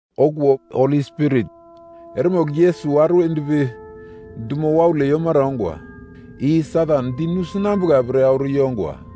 Okuwo Holi Spirit eremogl Yesus auro yendpi dumo waule yomara ongwa, i Satan di nusinambuka pre auro yongwa.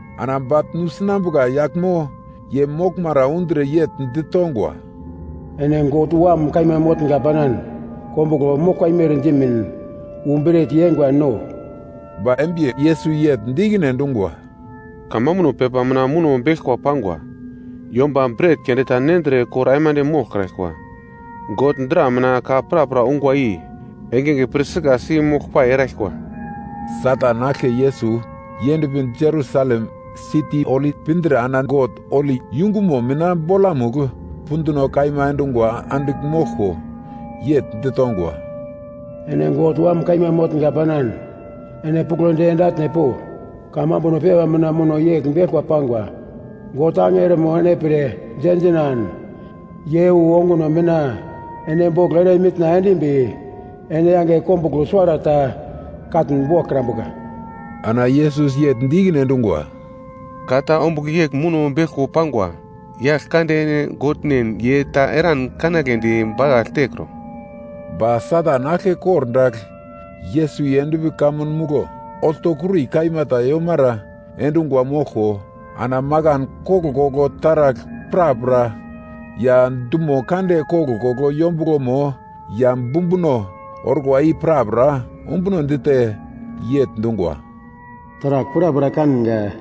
Ana bagl nusinambuka yaglmo ye moglmara undre yegl ditongwa, “Ene God Wam kaima motnga panan kombuglo moglkwa imer dimin wu bret yeingwa no.” Ba embi Yesus yegl di ikine endungwa, “Kamambuno pepa mina muno beglkwa pangwa, ‘Yomba bret keunde ta nendre kor aimande moglkraglkwa. God dra mina ka prapra ungwa i engenge pir sikasi moglpai eraglkwa.’” Satan aglke Yesus yendpi Jerusalem siti holi pindre ana God holi yungumo mina bolamugl punduno kaima endungwa andigl moglko. Yegl ditongwa, “Ene God Wam kaima motnga panan ene puglodi ende atne po. Kamambuno pepa mina muno yegl beglkwa pangwa: “‘God angelomo ene pre diendinan ye wu onguno mina ene boglo ere mitna endimbi, ene yange kombuglo suwarata katn boglkrambuka.’” Ana Yesus yegl di ikine endungwa, “Ka ta ombugl yegl muno beglko pangwa, ‘Yaglkande ene Godnen ye ta eran kanagledi bakagl tekro.’ Ba Satan aglke kordagl Yesus yendpi kamun muglo oltokuri kaima ta yomara endungwa moglko ana makan koglkoglo taragl prapra ya dumo kande koglkoglo yombuglomo ya bumbuno orkwa i prapra ombuno dite, yegl dungwa, “Taragl prapra kanga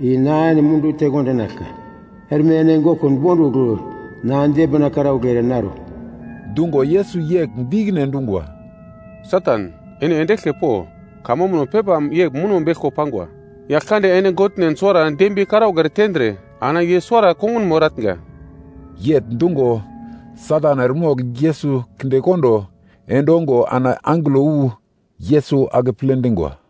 i na ene mundu tekondinaglka. Erme ene goglkun bondugl na dembina karaugl ere naro.” Dungo Yesus yegl di ikine endungwa, “Satan, ene ende eglke po. Kamambuno pepa yegl muno beglko pangwa, ‘Yaglkande ene Godnen suwara dembiye karaugl ere tendre ana ye suwara kongunmo eratnga.’” Yegl dungo Satan eremogl Yesus kindekondo endongo ana angelo wu Yesus akeple dingwa.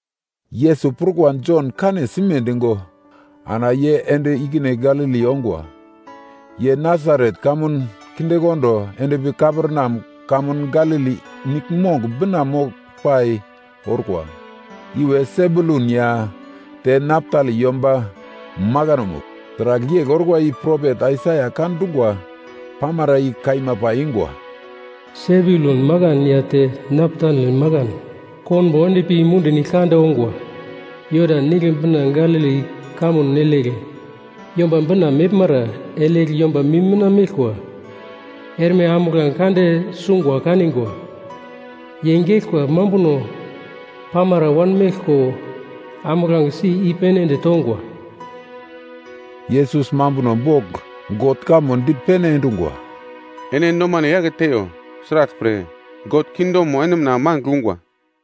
Yesus prukwa Jon kane sime digo ana ye ende ikine Galili ongwa. Ye Nasaret kamun kindekondo endpi Kaperneam kamun Galili niglmong bina moglpai orkwa, iwe Sebulun ya te Naptali yomba makanomugl. Sragl yegl orkwa i propet Aisaia ka dungwa pamara i kaima paiyungwa: “Sebulun makan ya te Naptali makan, konbo endpi mundi nigl kande ongwa, Jodan Nigle bina Galili kamun igle Yomba Bina meglmara. Igle yomba mim mina meglkwa, erme ambuglange kande sungwa kanigwa, ye geglkwa mambuno pamara wanmeglko, ambuglangesi i-pene ende tongwa.” Enge igle Yesus mambuno bogl God kamo di pene endungwa, “Ene nomano yake teiyo. Sraglpre God kingdomo ene mina mangigl ungwa.”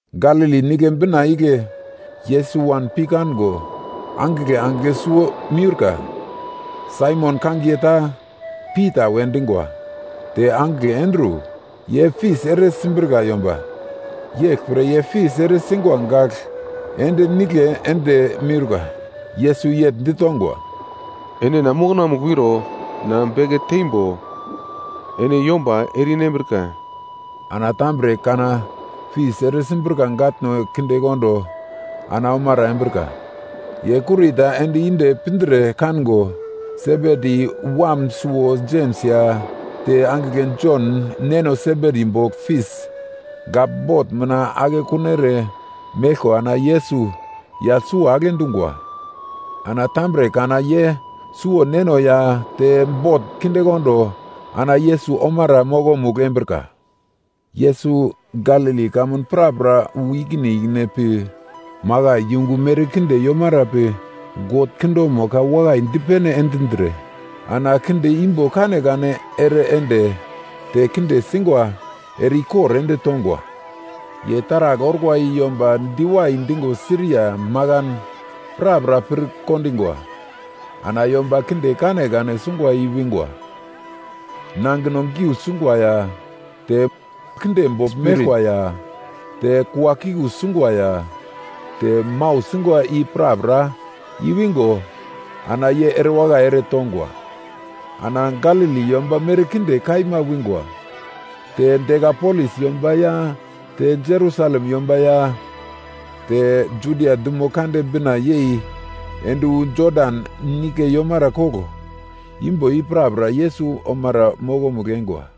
Galili Nigle bina igle Yesus wan pi kango angigle angigle suwo miurka. Saimon kangiye ta Pita we dingwa, te angigle Andru, ye fis ere simbrika yomba, yeglpre ye fis ere singwa gagl ende nigle ende miurka. Yesus yegl ditongwa, “Ene na mokonamugl wiro, na beke teimbo ene yomba ere-inambrika.” Ana tambre kana fis ere simbrika gatno kindekondo ana omara embrika. Ye kurita ende inde pindre kango, Sebedi wam suwo Jems ya te angigle Jon neno Sebedi bogl fis gagl bot mina ake kuno ere meglko ana Yesus yagl suwo agle dungwa. Ana tambre kana ye suwo neno ya te bot kindekondo ana Yesus omara mokomugl embrika. Yesus Galili kamun prapra wu ikine ikine pi, makai yungu merkinde yomara pi God kingdomo ka wakai dipene endindre ana kinde imbo kanekane ere ende, te kinde singwa ere ikor ende tongwa. Ye taragl orkwa i yomba diwai digo Siria makan prapra pirkondingwa. Ana yomba kinde kanekane sungwa i-wingwa. Nangino giugl singwa ya te spirit kinde bogl meglkwa ya te kuakiku singwa ya te mau singwa i prapra i-wingo, ana ye erewakai ere tongwa. Ana Galili yomba merkinde kaima wingwa, te Dikapolis yomba ya te Jerusalem yomba ya te Judia dumo kande bina yei ende wu Jodan Nigle yomara koglo imbo i prapra Yesus omara mokomugl eingwa.